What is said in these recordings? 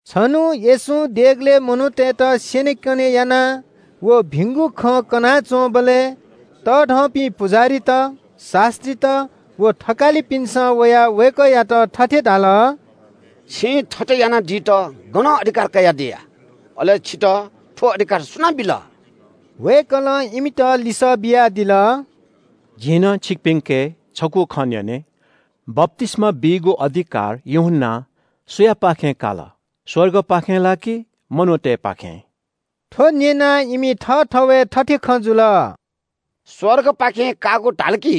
छन्‍हु येशूं देगलय् मनूतय्‌त स्‍यनेकने याना व भिंगु खँ कनाच्‍वंबलय् तःधंपिं पुजाहारीत, शास्‍त्रीत व थकालिपिन्‍सं वयाः वय्‌कःयात थथे धाल – “छिं थथे याना दित गनं अधिकार कयादिया? अले छितः थ्‍व अधिकार सुनां बिल?” वय्‌कलं इमित लिसः बियादिल – “जिं नं छिकपिन्‍के छगू खँ न्‍यने – बप्‍तिस्‍मा बीगु अधिकार यूहन्‍नां सुयापाखें काल? स्‍वर्गपाखें ला कि मनूतय्‌पाखें?” थ्‍व न्‍यनाः इमि थःथवय् थथे खँ जुल – “स्‍वर्गपाखें काःगु धाल कि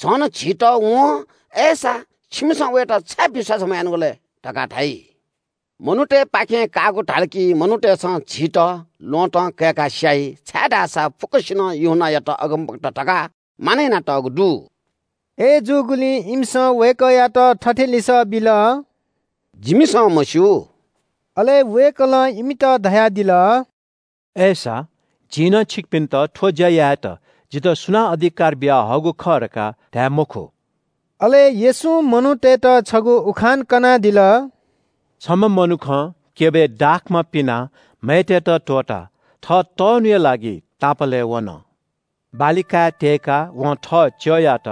झन झीत वं ‘अय्‌सा, छिमिसं वयात छाय् विश्‍वास मयानागु लय्?’ धकाः धाइ। मनूतय्‌पाखें काःगु धाल कि मनूतय्‌सं झीत ल्‍वहँतं कय्‌का स्‍याइ, छाय्‌धाःसा फुक्‍कसिनं यूहन्‍नायात अगमवक्ता धकाः मानय् यानातःगु दु।” अय्‌जूगुलिं इमिसं वय्‌कःयात थथे लिसः बिल – “जिमिसं मस्‍यू।” अले वय्‌कलं इमित धयादिल – “अय्‌सा, जिं नं छिकपिन्‍त थ्‍व ज्‍या यायेत जितः सुनां अधिकार बियाहःगु खः धकाः धाये मखु।” अले येशूं मनूतय्‌त छगू उखान कनादिल – “छम्‍ह मनुखं क्‍यबय् दाखमा पिनाः म्‍हय्‌तय्‌त त्‍वःताः थः तःन्‍हुया लागि तापालय् वन। बाली काय् त्‍यय्‌काः वं थः च्‍यःयात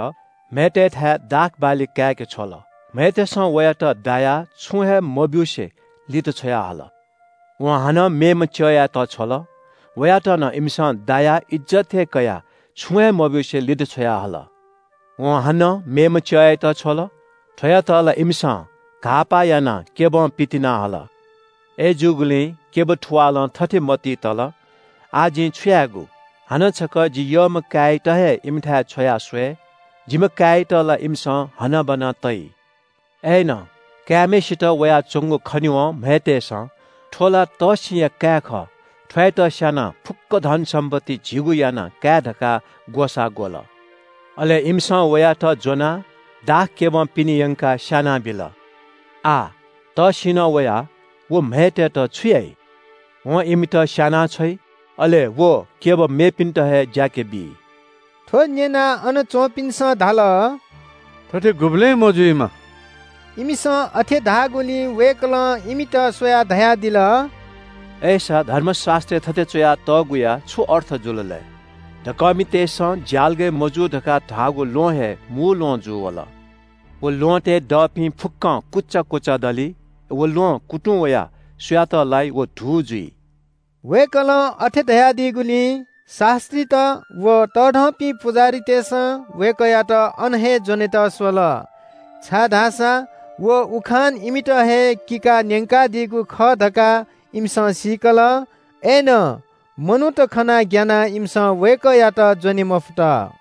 म्‍हय्‌तय्‌थाय् दाख बाली काय्‌के छ्वल। म्‍हय्‌तय्‌सं वयात दायाः छुं हे मब्‍यूसे लित छ्वयाहल। वं हानं मेम्‍ह च्‍यःयात छ्वल। वयात नं इमिसं दायाः इज्‍जत हे कयाः छुं हे मब्‍यूसे लित छ्वयाहल। वं हानं मेम्‍ह च्‍यःयात छ्वल। थ्‍वयात ला इमिसं घाःपाः यानाः क्‍यबं पितिना हल। “अय्‌जूगुलिं क्‍यब थुवालं थथे मतिइ तल – ‘आः जिं छु यायेगु? हानं छकः जि यःम्‍ह काय्‌यात हे इमिथाय् छ्वया स्‍वये, जिम्‍ह काय्‌यात ला इमिसं हनाबना तइ।’ “अय्‌नं काय्‌म्‍हय्‌सित वयाच्‍वंगु खनेवं म्‍हय्‌तय्‌सं – ‘थ्‍व ला तःसिंया काय् खः, थ्‍वयात स्‍यानाः फुक्‍क धनसम्‍पत्ति झीगु याना काये धकाः ग्‍वसाः ग्‍वल।’ अले इमिसं वयात ज्‍वनाः दाखक्‍यबं पिने यंकाः स्‍यानाबिल। “आः तःसिंनं वयाः व म्‍हय्‌तय्‌त छु याइ? वं इमित स्‍यानाछ्वइ, अले व क्‍यब मेपिन्‍त हे ज्‍याके बी।” थ्‍व न्‍यनाः अन च्‍वंपिन्‍सं धाल – “थथे गुबलें मजुइमा।” इमिसं अथे धाःगुलिं वय्‌कलं इमित स्‍वयाः धयादिल – “अय्‌सा धर्मशास्‍त्रय् थथे च्‍वया तःगुया छु अर्थ जुल लय्? “‘दकःमितय्‌सं ज्‍यालगय् मजूगु धकाः धाःगु ल्‍वहं हे मू ल्‍वहं जूवल।’ “व ल्‍वहँतय् दःपिं फुक्‍कं कुचा कुचा दली। अले व ल्‍वहं कुतुं वयाः सुयात लाइ व धू जुइ।” वय्‌कलं अथे धयादीगुलिं शास्‍त्रीत व तःधंपिं पुजाहारीतय्‌सं वय्‌कःयात अन हे ज्‍वनेत स्‍वल, छाय्‌धाःसा व उखान इमित हे किकाः न्‍यंकादीगु खः धकाः इमिसं सीकल। अय्‌नं मनूत खनाः ग्‍यानाः इमिसं वय्‌कःयात ज्‍वने मफुत।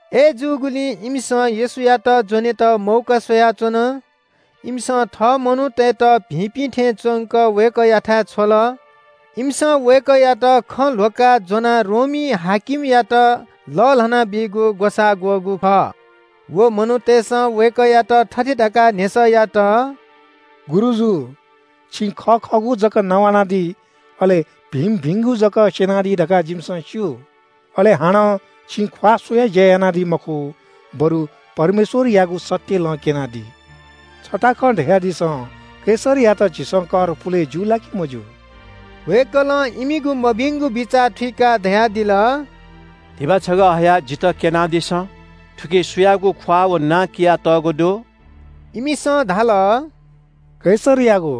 अय्‌जूगुलिं इमिसं येशूयात ज्‍वनेत मौका स्‍वयाच्‍वन। इमिसं थः मनूतय्‌त भिंपिं थें च्‍वंक वय्‌कःयाथाय् छ्वल। इमिसं वय्‌कःयात खँ ल्‍ह्वकाः ज्‍वनाः रोमी हाकिमयात लःल्‍हाना बीगु ग्‍वसाः ग्‍वःगु खः। व मनूतय्‌सं वय्‌कःयात थथे धकाः न्‍ह्यसः यात – “गुरुजु, छिं खः खःगु जक नवानादी, अले भिंभिंगु जक स्‍यनादी धकाः जिमिसं स्‍यू। अले हानं छिं ख्‍वाः स्‍वयाः ज्‍या यानादी मखु, बरु परमेश्‍वरयागु सत्‍य लँ क्‍यनादी। छता खँ धयादिसँ, कैसरयात झीसं कर पुले ज्‍यू ला कि मज्‍यू?” वय्‌कलं इमिगु मभिंगु बिचाः थुइकाः धयादिल – “धिबा छगः हयाः जितः क्‍यनादिसँ। थुकी सुयागु ख्‍वाः व नां कियातःगु दु?” इमिसं धाल – “कैसरयागु।”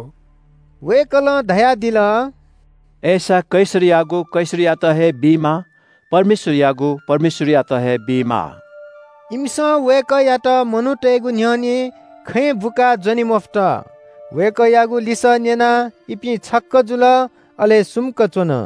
वय्‌कलं धयादिल – “अय्‌सा कैसरयागु कैसरयात हे बीमाः, परमेश्‍वरयागु परमेश्‍वरयात हे बीमाः।” इमिसं वय्‌कःयात मनूतय्‌गु न्‍ह्यःने खँय् बुकाः ज्‍वने मफुत। वय्‌कःयागु लिसः न्‍यनाः इपिं छक्‍क जुल, अले सुम्‍क च्‍वन।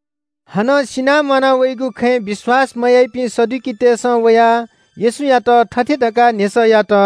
हानं सिनाः म्‍वाना वइगु खँय् विश्‍वास मयाइपिं सदुकीतय्‌सं वयाः येशूयात थथे धकाः न्‍ह्यसः यात –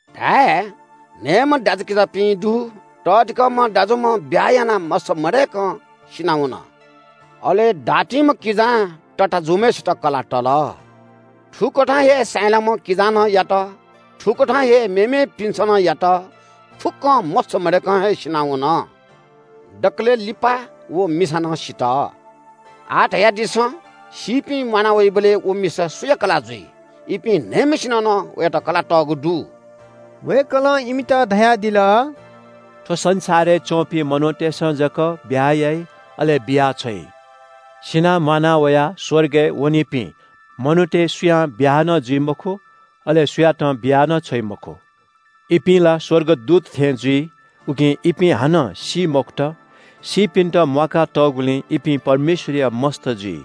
धाये – न्‍हय्‌म्‍ह दाजुकिजापिं दु। तःधिकःम्‍ह दाजुम्‍ह ब्‍याहा यानाः मस्‍त मदय्‌क सिनावन। अले दातिम्‍ह किजां तताःजुम्‍हय्‌सित कलाः तल। थुकथं हे साहिँलाम्‍ह किजां नं यात। थुकथं हे मेमेपिन्‍सं नं यात। फुक्‍कं मस्‍त मदय्‌कं हे सिनावन। दकलय् लिपा व मिसा नं सित। आः धयादिसँ, सीपिं म्‍वाना वइबलय् व मिसा सुया कलाः जुइ? इपिं न्‍हय्‌म्‍हय्‌सिनं नं वयात कलाः तःगु दु।” वय्‌कलं इमित धयादिल – “थ्‍व संसारय् च्‍वंपिं मनूतय्‌सं जक ब्‍याहा याइ, अले बियाछ्वइ। सिनाः म्‍वाना वयाः स्‍वर्गय् वनीपिं मनूतय् सुयां ब्‍याहा नं जुइ मखु। अले सुयातं बिया नं छ्वइ मखु। इपिं ला स्‍वर्गदूत थें जुइ, उकिं इपिं हानं सी मखुत। सीपिन्‍त म्‍वाका तःगुलिं इपिं परमेश्‍वरया मस्‍त जुइ।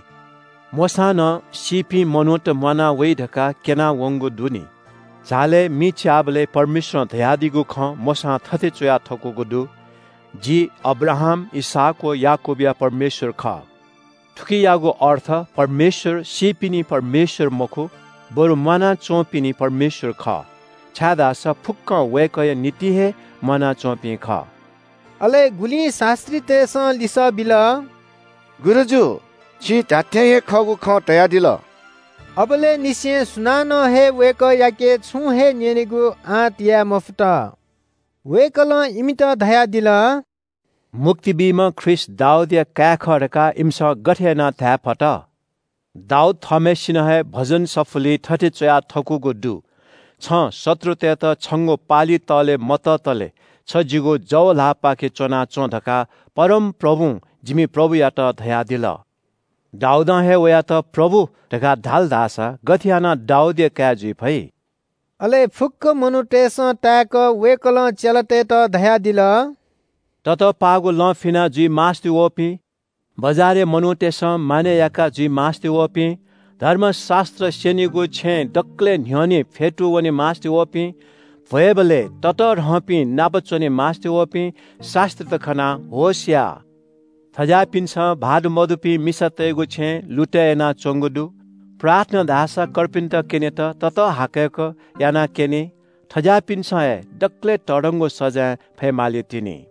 “मोशां नं सीपिं मनूत म्‍वाना वइ धकाः क्‍यना वंगु दु नि। झालय् मि च्‍याःबलय् परमेश्‍वरं धयादीगु खँ मोशां थथे च्‍वया थकूगु दु – ‘जि अब्राहाम, इसहाक व याकूबया परमेश्‍वर खः।’ थुकियागु अर्थ परमेश्‍वर सीपिनि परमेश्‍वर मखु, बरु म्‍वाना च्‍वंपिनि परमेश्‍वर खः, छाय्‌धाःसा फुक्‍कं वय्‌कःया निंतिं हे म्‍वानाच्‍वंपिं खः।” अले गुलिं शास्‍त्रीतय्‌सं लिसः बिल – “गुरुजु, छिं धात्‍थें हे खःगु खँ धयादिल।” अबलय् निसें सुनानं हे वय्‌कःयाके छुं हे न्‍यनेगु आँट याये मफुत। वय्‌कलं इमित धयादिल – “मुक्ति बीम्‍ह ख्रीष्‍ट दाऊदया काय् खः धकाः इमिसं गथे यानाः धायेफत? दाऊद थःम्‍हय्‌सिनं हे भजन सफुलिइ थथे च्‍वया थकूगु दु – “‘छं शत्रुतय्‌त छंगु पालि तःले मततले छ जिगु जव ल्‍हाःपाखे च्‍वनाच्‍वँ धकाः परमप्रभुं जिमि प्रभुयात धयादिल।’ “दाऊदं हे वयात ‘प्रभु’ धकाः धाल धाःसा गथे यानाः दाऊदया काय् जुइ फइ?” अले फुक्‍क मनूतय्‌सं ताय्‌क वय्‌कलं चेलातय्‌त धयादिल – “ततःपाःगु लं फिना जुइ मास्‍ति वःपिं, बजारय् मनूतय्‌सं मानय् याका जुइ मास्‍ति वःपिं, धर्मशास्‍त्र स्‍यनीगु छेँय् दकलय् न्‍ह्यःने फ्‍यतू वने मास्‍ति वःपिं, भ्‍वय्‌बलय् ततःधंपिं नाप च्‍वने मास्‍ति वःपिं शास्‍त्रीत खनाः होश या। थज्‍याःपिन्‍सं भाःत मदुपिं मिसातय्‌गु छेँ लुतय् यानाच्‍वंगु दु, प्रार्थना धाःसा कर्पिन्‍त क्‍यनेत ततःहाकय्‌क यानाक्‍यनी। थज्‍याःपिन्‍सं हे दकलय् तःधंगु सजाँय फये मालीतिनि।”